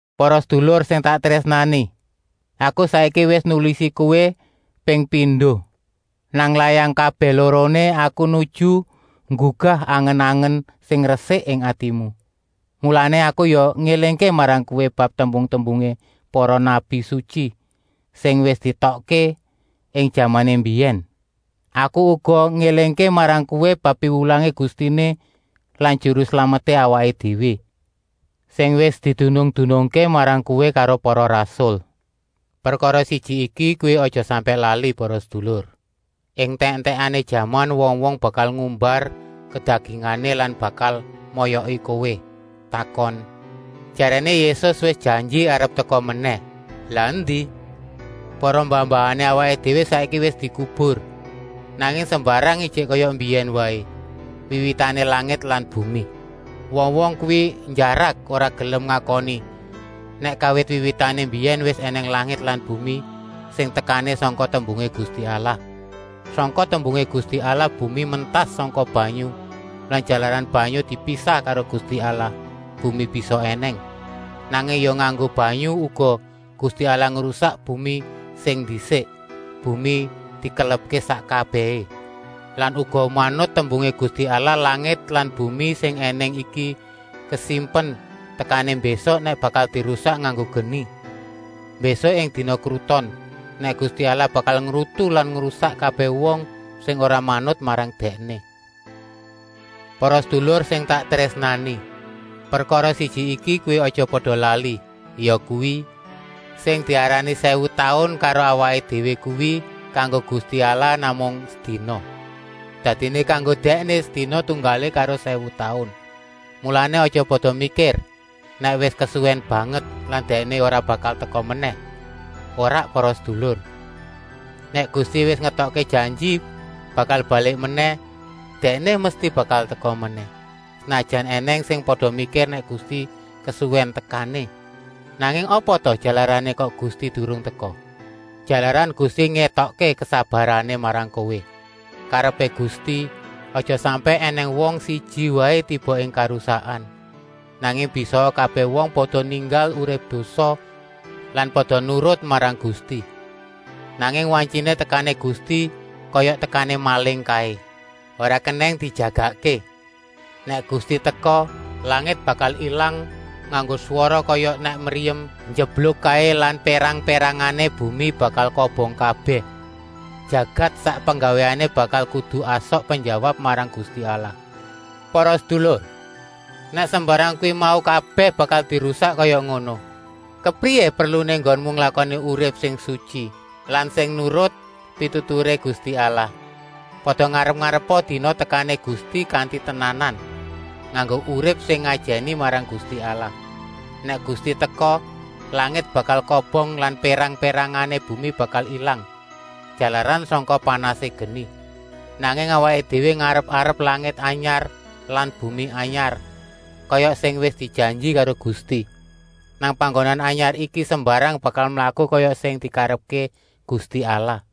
Para sedulur sing tak trésnani, aku saiki wis nulisi kowé ping pindo. Nang layang kabèh loroné aku nuju nggugah angen-angen sing resik ing atimu. Mulané aku ya ngélingké marang kowé bab tembung-tembungé para nabi sutyi sing wis dietokké ing jamané mbiyèn. Aku uga ngélingké marang kowé bab piwulangé Gustiné lan Juru Slameté awaké déwé, sing wis didunung-dunungké marang kowé karo para rasul. Prekara siji iki kowé aja sampèk lali para sedulur! Ing entèk-entèkané jaman wong-wong bakal ngumbar kedagingané lan bakal moyoki kowé, takon: “Jaréné Yésus wis janji arep teka menèh, lah endi? Para mbah-mbahané awaké déwé saiki wis dikubur, nanging sembarang ijik kaya mbiyèn waé, wiwitané langit lan bumi.” Wong-wong kuwi njarak ora gelem ngakoni nèk kawit wiwitané mbiyèn wis ènèng langit lan bumi sing tekané sangka tembungé Gusti Allah. Sangka tembungé Gusti Allah bumi mentas sangka banyu lan jalaran banyu dipisah karo Gusti Allah, bumi bisa ènèng. Nanging ya nganggo banyu uga Gusti Allah ngrusak bumi sing ndisik, bumi dikelepké sak kabèhé. Lan uga manut tembungé Gusti Allah langit lan bumi sing ènèng iki kasimpen tekané mbésuk nèk bakal dirusak nganggo geni, mbésuk ing dina kruton, nèk Gusti Allah bakal ngrutu lan ngrusak kabèh wong sing ora manut marang Dèkné. Para sedulur sing tak trésnani, prekara siji iki kowé aja pada lali, yakuwi: sing diarani sèwu taun karo awaké déwé kuwi kanggo Gusti Allah namung sedina. Dadiné kanggo Dèkné sedina tunggalé karo sèwu taun. Mulané aja pada mikir nèk wis kesuwèn banget lan Dèkné ora bakal teka menèh. Ora para sedulur, nèk Gusti wis ngetokké janji bakal balik menèh, Dèkné mesti bakal teka menèh, senajan ènèng sing pada mikir nèk Gusti kesuwèn tekané. Nanging apa ta jalarané kok Gusti durung teka? Jalaran Gusti ngétokké kesabarané marang kowé. Karepé Gusti, aja sampèk ènèng wong siji waé tiba ing karusakan, nanging bisaa kabèh wong pada ninggal urip dosa lan pada nurut marang Gusti. Nanging wantyiné tekané Gusti kaya tekané maling kaé, ora kenèng dijagakké. Nèk Gusti teka, langit bakal ilang nganggo swara kaya nèk kanon njebluk kaé lan pérang-pérangané bumi bakal kobong kabèh. Jagat sak penggawéné bakal kudu asok penjawab marang Gusti Allah. Para sedulur, nèk sembarang kuwi mau kabèh bakal dirusak kaya ngono, kepriyé perluné enggonmu nglakoni urip sing sutyi lan sing nurut pituturé Gusti Allah. Pada ngarep-arepa dina tekané Gusti kanti tenanan, nganggo urip sing ngajèni marang Gusti Allah. Nèk Gusti teka, langit bakal kobong lan pérang-pérangané bumi bakal ilang, jalaran sangka panasé geni. Nanging awaké déwé ngarep-arep langit anyar lan bumi anyar, kaya sing wis dijanji karo Gusti. Nang panggonan anyar iki sembarang bakal mlaku kaya sing dikarepké Gusti Allah.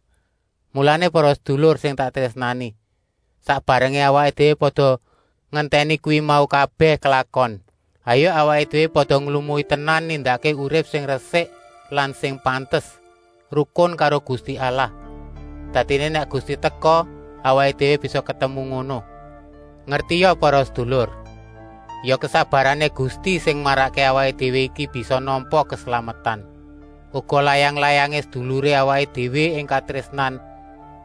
Mulané para sedulur sing tak trésnani, sak barengé awaké déwé pada ngentèni kuwi mau kabèh klakon, hayuk awaké déwé pada nglumui tenan nindakké urip sing resik lan sing pantes, rukun karo Gusti Allah. Dadiné nèk Gusti teka, awaké déwé bisa ketemu ngono. Ngertia para sedulur, ya kesabarané Gusti sing marakké awaké déwé iki bisa nampa keslametan. Uga layang-layangé seduluré awaké déwé ing katrésnan,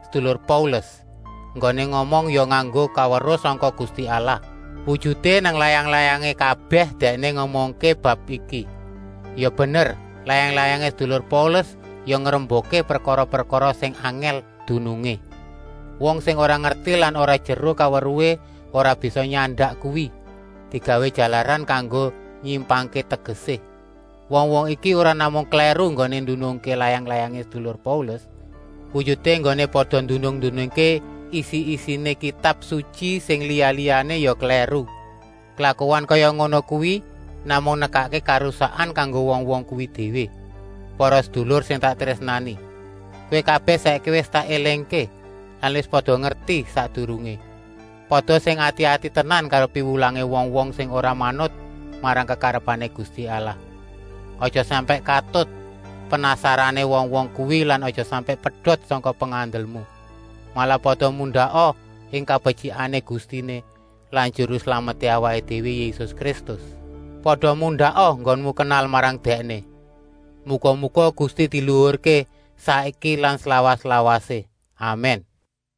sedulur Paulus, enggoné ngomong ya nganggo kaweruh sangka Gusti Allah. Wujuté, nang layang-layangé kabèh dèkné ngomongké bab iki. Ya bener, layang-layangé sedulur Paulus ya ngrembukké prekara-prekara sing angèl dunungé. Wong sing ora ngerti lan ora jeru kaweruhé ora bisa nyandak kuwi, digawé jalaran kanggo nyimpangké tegesé. Wong-wong iki ora namung klèru enggoné ndunungké layang-layangé sedulur Paulus, wujuté enggoné pada ndunung-ndunungké isi-isiné Kitab Sutyi sing liya-liyané ya klèru. Klakuan kaya ngono kuwi namung nekakké karusakan kanggo wong-wong kuwi déwé. Para sedulur sing tak trésnani, kowé kabèh saiki wis tak élingké lan wis pada ngerti sakdurungé. Pada sing ati-ati tenan karo piwulangé wong-wong sing ora manut marang kekarepané Gusti Allah. Aja sampèk katut penasarané wong-wong kuwi lan aja sampèk pedot sangka pengandelmu. Malah pada mundaka ing kabetyikané Gustiné lan Juru Slameté awaké déwé Yésus Kristus. Pada mundaka enggonmu kenal marang Dèkné. Muga-muga Gusti diluhurké, saiki lan slawas-lawasé! Amèn. Pétrus